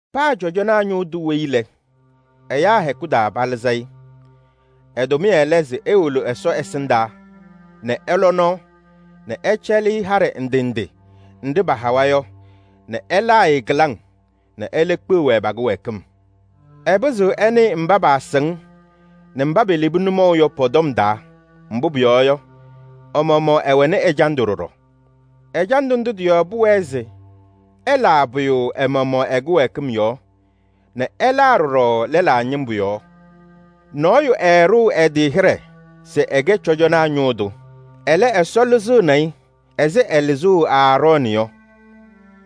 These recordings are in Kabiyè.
Paa cɔjɔnaa ñʋʋ tʋ weyi lɛ, ɛyaa hɛkʋ taa palɩzɩ-ɩ. Ɛ-tʋmɩyɛ lɛ se ewolo Ɛsɔ ɛsɩndaa nɛ ɛyaa nɔɔ nɛ ɛcɛlɩ-ɩ haɖɛ ndɩ ndɩ nɖɩ pahawa yɔ nɛ ɛlaa-ɩ kɩlaŋ nɛ ɛlɛ kpeɣ-wɛ pa-kɩwɛɛkɩm. Ɛpɩzɩɣ ɛnɩnɩ kɩɩsɩŋɩyɩŋ nɛ mba pelebi nʋmɔʋ yɔ. Mbʋ pʋyɔɔ yɔ, ɛ-maɣmaɣ ɛwɛnɩ ɛjandʋ ɖɔɖɔ. Ɛjandʋ ndʋ tɩ-yɔɔ pʋwɛɛ se ɛlaa pʋyʋ ɛ-maɣmaɣ ɛ-kɩwɛɛkɩm yɔɔ nɛ ɛlaa ɖɔɖɔ lɛlaa ñɩmbʋ yɔɔ. Nɔɔyʋ ɛɛɖʋʋ ɛ-tɩ hɩɖɛ se ɛkɛ cɔjɔnaa ñʋʋ tʋ. Ɛlɛ, Ɛsɔ lɩzɩɣnɩ-ɩ ɛzɩ ɛlɩzʋʋ Aarɔɔnɩ yɔ.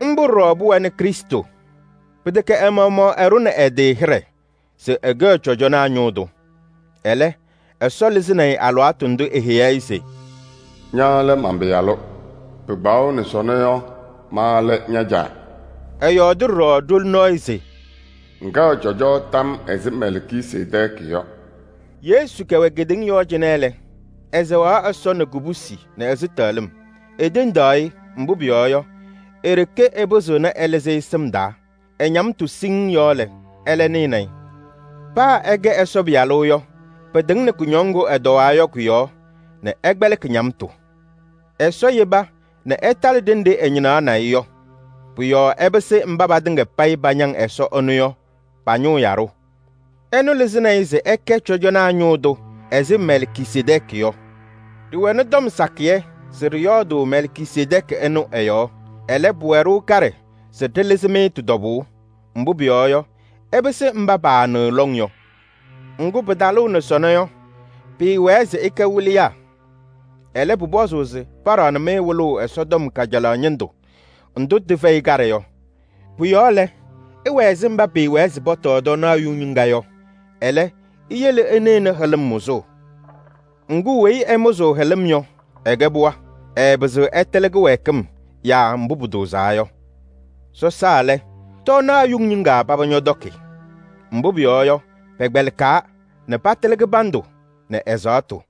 Mbʋ ɖɔɖɔ pʋwɛnɩ Krɩstʋ. Pɩtɛkɛ ɛ-maɣmaɣ ɛɖʋnɩ ɛ-tɩ hɩɖɛ se ɛkɛɣ cɔjɔnaa ñʋʋ tʋ. Ɛlɛ, Ɛsɔ lɩzɩnɩ-ɩ alɩwaatʋ ndʋ eheyi-i se: “Ña lɛ man-Pɩyalʋ. Pɩkpaɣʋnɩ sɔnɔ yɔ, ma lɛ ña-Caa.” Ɛyɔɔdɩ ɖɔɖɔ ɖoli nɔɔyʋ se: “Ŋkɛɣ cɔjɔ tam yɔɔ ɛzɩ Mɛlkisedɛɛkɩ yɔ.” Yesu kɛwɛ kedeŋa yɔɔ cɩnɛ lɛ, ɛsɛɣaɣ Ɛsɔ nɛ kubusi nɛ ɛzɩtɛɣlɩm. Etendaɣ-ɩ, mbʋ pʋyɔɔ yɔ, e-ɖeke ɛpɩzɩɣnɩ ɛlɩzɩ-ɩ sɩm taa. Ɛ-ñamtʋ siŋŋ yɔɔ lɛ, ɛlɛ nɩnɩ-ɩ. Paa se ɛkɛ Ɛsɔ Pɩyalʋ yɔ, pɩtɩŋnɩ kʋñɔŋ ŋgʋ ɛtɔwaa yɔ kʋ-yɔɔ nɛ ɛkpɛlɩkɩ ñamtʋ. Ɛsɔ yeba nɛ ɛtalɩ ɖenɖe ɛñɩnaɣnɩ-ɩ yɔ. Pʋ-yɔɔ ɛpɩsɩ mba patɩŋa pañaŋ Ɛsɔ ɛnʋ yɔ pa-ñʋʋ yaɖʋ. Ɛnʋ lɩzɩnɩ-ɩ se ɛkɛ cɔjɔnaa ñʋʋ tʋ ɛzɩ Mɛlkisedɛɛkɩ yɔ. Ɖɩwɛnɩ tɔm sakɩyɛ se ɖɩyɔɔdʋʋ Mɛlkisedɛɛkɩ ɛnʋ ɛ-yɔɔ. Ɛlɛ, pʋwɛ-ɖʋ kaɖɛ se ɖɩlɩzɩ-mɩ tɩ-tɔbʋʋ. Mbʋ pʋyɔɔ yɔ, ɩpɩsɩ mba paanɩɣ lɔŋ yɔ. Ŋgʋ, pɩtalʋʋ nɛ sɔnɔ yɔ, pɩɩwɛɛ se ɩkɛ wɩlɩyaa. Ɛlɛ, pʋpɔzʋʋ se paɖaɣnɩ-mɩ wɩlʋʋ Ɛsɔtɔm kajalaɣ ñɩndʋ ndʋ tɩfɛyɩ kaɖɛ yɔ. Pʋ-yɔɔ lɛ, ɩwɛ ɛzɩ mba pɩɩwɛɛ se pɔtɔɔ tɔɔnaɣ yuŋ ñɩŋga yɔ, ɛlɛ, iyele ɩnɩɣnɩ hɩlɩm mʋzʋʋ. Ŋgʋ, weyi ɛmʋzʋʋ hɩlɩm yɔ, ɛkɛ pɩɣa. Ɛɛpɩzɩɣ ɛtɩlɩ kɩwɛɛkɩm yaa mbʋ pʋtʋʋzaa yɔ. Sɔsaa lɛ, tɔɔnaɣ yuŋ ñɩŋga paba ñɔtɔkɩ. Mbʋ pʋyɔɔ yɔ, pɛkpɛlɩkaa nɛ patɩlɩ kɩbandʋ nɛ ɛzaɣtʋ.